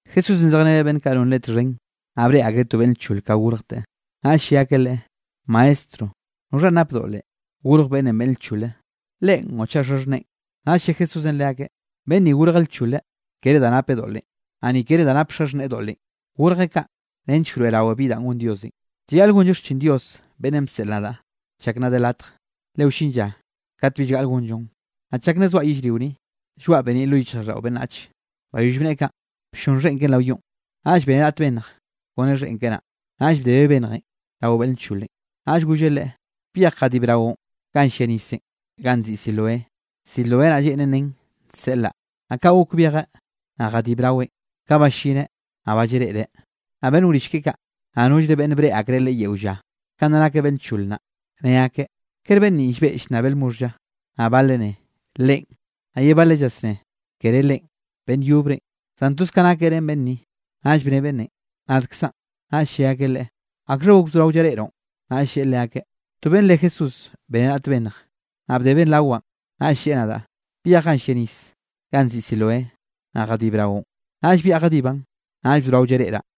Jesúsenꞌ zejreneꞌ beꞌnn kaꞌ non Leꞌe txhen, naꞌ breꞌe akreꞌ to beꞌnn nchole ka gorjteꞌ. Naꞌll lle akeꞌ Leꞌe: —Maestro, ¿noxha nap doꞌlenꞌ, gorj beꞌnnenꞌ beꞌnn lchole, leꞌen o chaꞌ xaxhneꞌen? Naꞌll lle Jesúsenꞌ leakeꞌ: —Beꞌnn ni gorjeꞌ nchole kere da napeꞌ doꞌlenꞌ, naꞌ ni kere da nap xaxhneꞌe doꞌlenꞌ, gorjeꞌ kaꞌ nench wroeꞌrawe bi danꞌ gon Diosenꞌ. Llayaꞌl gonllo xchin Dios beꞌnnenꞌ bseꞌl nadaꞌ, chak nna de latje. Le wllin lla kat bill gaꞌl gonllon. Naꞌ chak nna zoaꞌ yellrio ni, llgoaꞌ beniꞌ lo yichjraꞌlldaꞌo beꞌnnache. Bayoll bneꞌe kaꞌn, blloꞌnn xheꞌn keꞌen rao yonꞌ, naꞌll beneꞌ raꞌt bennj kone xheꞌn keꞌe naꞌ, naꞌll bdebeꞌ bennjenꞌ rao beꞌnn lcholenꞌ. Naꞌll golleꞌ leꞌe: —Byej jadib raoꞌn ganꞌ llia nisenꞌ ganꞌ nziꞌi Siloé. (Siloé naꞌ lleꞌnen nen Nseꞌlaꞌ.) Naꞌ kaꞌ gok byejeꞌ, naꞌ jadib raweꞌn, ka ballineꞌ, naꞌ ba llareꞌreꞌ. Naꞌ beꞌnn wrill keꞌe kaꞌ, naꞌ nollre beꞌnne breꞌe akreꞌ leꞌe yeo lla, kanꞌ nna nakeꞌ beꞌnn nchole naꞌ, ne akeꞌ: —¿Kere beꞌnn ninꞌ llbeꞌ llnnabeꞌ lmoxh lla? Naꞌ baleꞌ ne: —Leꞌen. Naꞌ ye baleꞌ llasné: —Kere leꞌen, beꞌnn yobrenꞌ, zan toz ka nakeꞌ ren beꞌnn ni. Naꞌll bne beꞌnnenꞌ: —Nadkzaꞌn. Naꞌll lle akeꞌ leꞌe: —¿Akxha gok bzorao llareꞌroꞌn? Naꞌll lleꞌe leakeꞌ: —To beꞌnn re Jesús beneꞌ raꞌt bennj, naꞌ bdebeꞌn rawaꞌn, naꞌll lleꞌe nadaꞌ: “Byej ganꞌ llia nis ganꞌ nziꞌi Siloé, naꞌ jadib raoꞌn.” Naꞌll byaꞌa jadibaꞌn, naꞌll bzorao llareꞌraꞌ.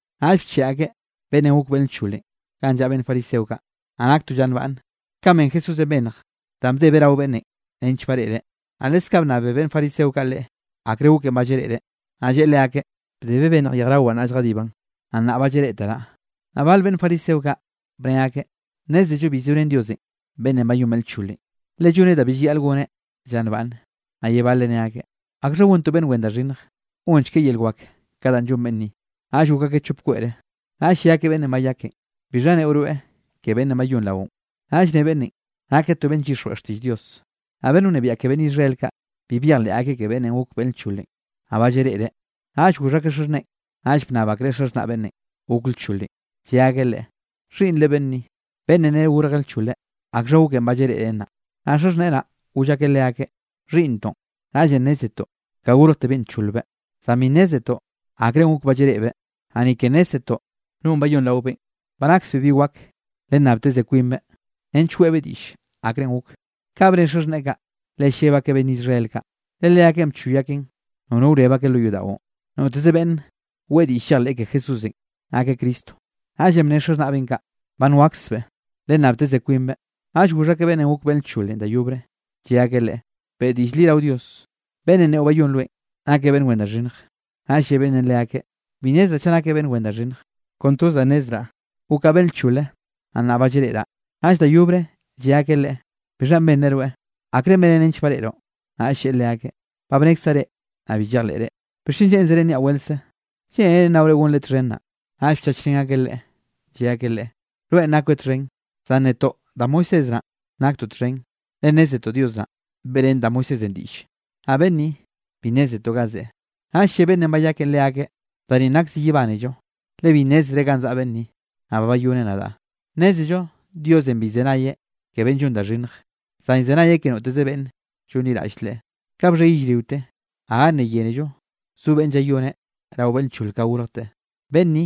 Naꞌll bcheꞌe akeꞌ beꞌnnenꞌ gok beꞌnn lcholenꞌ ganꞌ llaꞌa beꞌnn fariseo kaꞌ. Naꞌ nak to lla nbaꞌnne, kanꞌ ben Jesúsenꞌ bennj danꞌ bdebeꞌ rao beꞌnnenꞌ nench bareꞌreꞌ. Naꞌ leskaꞌ bnnabe beꞌnn fariseo kaꞌ leꞌe, akre goken ba llareꞌreꞌ, naꞌ lleꞌe leakeꞌ: —Bdebeꞌ bennj yejrawaꞌn naꞌll jadibaꞌn, naꞌ nnaꞌ ba llareꞌteraꞌ. Naꞌ bale beꞌnn fariseo kaꞌ, bne akeꞌ: —Nnézello bi zorén Diosenꞌ beꞌnnenꞌ bayón beꞌnn lcholenꞌ, le lloneꞌ da bi llayaꞌl goneꞌ lla nbaꞌnne. Naꞌ ye baleꞌ ne akeꞌ: —¿Akxha gon to beꞌnn wen da xhinnj, gonchekeꞌ yel wak ka danꞌ llon beꞌnn ni? Naꞌll gok akeꞌ chop kweꞌre. Naꞌll lle akeꞌ beꞌnnenꞌ bayakenꞌ: —¿Bixha neꞌo rweꞌ ke beꞌnnenꞌ bayón raoꞌn? Naꞌll ne beꞌnnenꞌ: —Nakeꞌ to beꞌnn llyixjweꞌ xtiꞌll Dios. Naꞌ beꞌnn wnebiaꞌ ke beꞌnn Israel kaꞌ, bi byejleꞌ akeꞌ ke beꞌnnenꞌ gok beꞌnn lcholenꞌ, naꞌ ba llareꞌreꞌ. Naꞌll goxh akeꞌ xaxhneꞌen. Naꞌll bnnab akreꞌ xaxhnaꞌ beꞌnnenꞌ gok lcholenꞌ, lle akeꞌ leakeꞌ: —¿Xhiꞌnnre beꞌnn ni, beꞌnnenꞌ nere gorjeꞌ nchole? ¿Akxha goken ba llareꞌreꞌ nnaꞌ? Naꞌ xaxhneꞌe naꞌ, goll akeꞌ leakeꞌ: —Xhiꞌnntoꞌn, naꞌllenꞌ nnézetoꞌ ka gorjtebeꞌn ncholbeꞌ. Zan bi nnézetoꞌ akrenꞌ gok ba llareꞌbeꞌ, naꞌ ni ke nnézzetoꞌ nonꞌ bayón raobeꞌn. Ba naksbeꞌ bi wak, lennabteze kwinbeꞌ, nench weꞌbeꞌ diꞌll akrenꞌ gok. Kaꞌ bne xaxhneꞌe kaꞌ, le lleb akeꞌ beꞌnn Israel kaꞌ, le leakeꞌn bchoy akeꞌn nono wreb akeꞌ lo yodaꞌon, noteze beꞌnn weꞌe diꞌll llejleꞌ ke Jesúsenꞌ nakeꞌ Cristo. Naꞌllenꞌ bne xaxhnaꞌbeꞌn kaꞌ: “Ba nwaksbeꞌ, lennabteze kwinbeꞌ.” Naꞌll goxh akeꞌ beꞌnnenꞌ gok beꞌnn lcholenꞌ da yobre, lle akeꞌ leꞌe: —Beꞌe diꞌll li rao Dios. Beꞌnnenꞌ neꞌo bayón rweꞌn, nakeꞌ beꞌnn wen da xhinnje. Naꞌll lle beꞌnnenꞌ leakeꞌ: —Bi nnezraꞌ chaꞌ nakeꞌ beꞌnn wen da xhinnje. Kon toz da nnezraꞌ, gokaꞌ beꞌnn lchole, naꞌ nnaꞌ ba llareꞌraꞌ. Naꞌll da yobre lle akeꞌ leꞌe: —¿Bixha benreꞌ rweꞌ? ¿Akre beneꞌn nench bareꞌroꞌ? Naꞌll lleꞌe leakeꞌ: —Ba bnekzaꞌ reꞌ, naꞌ bi llejleꞌre. ¿Bixchen lleꞌnzere nniaꞌ weltze? ¿Lleꞌnere nnaore gonreꞌ txhen naꞌ? Naꞌll bchachrén akeꞌ leꞌe, lle akeꞌ leꞌe: —Rweꞌn nakoeꞌ txhen, zan netoꞌ da Moisés naꞌ, naktoꞌ txhen. Le nnézetoꞌ Dios naꞌ, beꞌrén da Moisésenꞌ diꞌlle, naꞌ beꞌnn ni, bi nnézetoꞌ ga zeꞌe. Naꞌll lle beꞌnnenꞌ bayakenꞌ leakeꞌ: —Da ninꞌ nak zi yebánello, le bi nnézere ga zaꞌa beꞌnn ni, naꞌ ba bayoneꞌ nadaꞌ. Nnézello Diosenꞌ bi llzenayeꞌ ke beꞌnn llon da xhinnje, zan llzenayeꞌ ke noteze beꞌnn llonliraꞌll Leꞌe. Ka bxhe yellriote, gaga nna yénello zo beꞌnne llayoneꞌ rao beꞌnn nchol ka gorjteꞌ. Beꞌnn ni,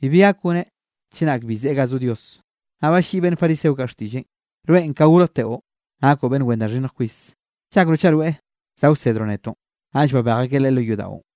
bibi gak goneꞌ chenak bi zeꞌe ga zo Dios. Naꞌ balliꞌi beꞌnn fariseo kaꞌ xtiꞌlleꞌn: —Rweꞌn ka gorjteꞌo nakoꞌ beꞌnn wen da xhinnj kwis. ¿Llakroꞌ chaꞌ rweꞌ za wsedroꞌ netoꞌn? Naꞌll babej akeꞌ leꞌe lo yodaꞌon.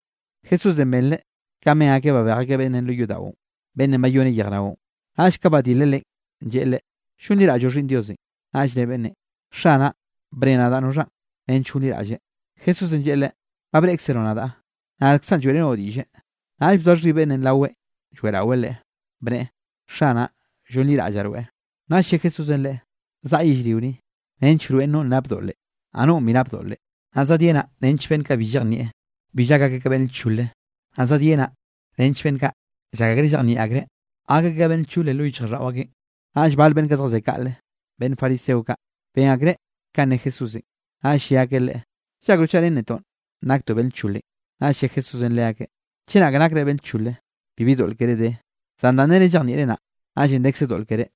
Jesúsenꞌ benreꞌ kanꞌ ben akeꞌ babej akeꞌ beꞌnnenꞌ lo yodaꞌon, beꞌnnenꞌ bayoneꞌ yejraonꞌ, naꞌll ka badileꞌ leꞌen, lleꞌe leꞌe: —¿Llonliraꞌlloꞌ Xhiꞌnn Diosenꞌ? Naꞌll ne beꞌnnenꞌ: —Xanaꞌ, bne nadaꞌ noxhanꞌ, nench gonliraꞌlleꞌ. Jesúsenꞌ lleꞌe leꞌe: —Ba breꞌkzeroꞌ nadaꞌ, nadkzaꞌn lloeꞌrenoꞌ diꞌlle. Naꞌll bzoa xhib beꞌnnenꞌ raweꞌ lloeꞌraweꞌ Leꞌe, bneꞌe: —Xanaꞌ, llonliraꞌllaꞌ rweꞌ. Naꞌll lle Jesúsenꞌ leꞌe: —Zaꞌa yellrio ni, nench wroeꞌn nonꞌ nap doꞌle, naꞌ nonꞌ bi nap doꞌle, naꞌ zadyenaꞌ nench beꞌnn kaꞌ bi llejnieꞌ, bill gak akeꞌ ka beꞌnn lchole, naꞌ zadyenaꞌ nench beꞌnn kaꞌ llak akreꞌ llejnieꞌ akreꞌ, gak akeꞌ ka beꞌnn nchole lo yichjraꞌlldaꞌo akeꞌn. Naꞌll bal beꞌnn kaꞌ zjazé kaꞌle, beꞌnn fariseo kaꞌ, ben akreꞌ kanꞌ ne Jesúsenꞌ, naꞌll lle akeꞌ Leꞌe: —¿Llakroꞌ chaꞌ ren netoꞌn naktoꞌ beꞌnn lcholenꞌ? Naꞌll lle Jesúsenꞌ leakeꞌ: —Chenak nakre beꞌnn lchole, bibi doꞌl keré de, zan danꞌ nere llejnieꞌre naꞌ, naꞌllenꞌ dekze doꞌl keré.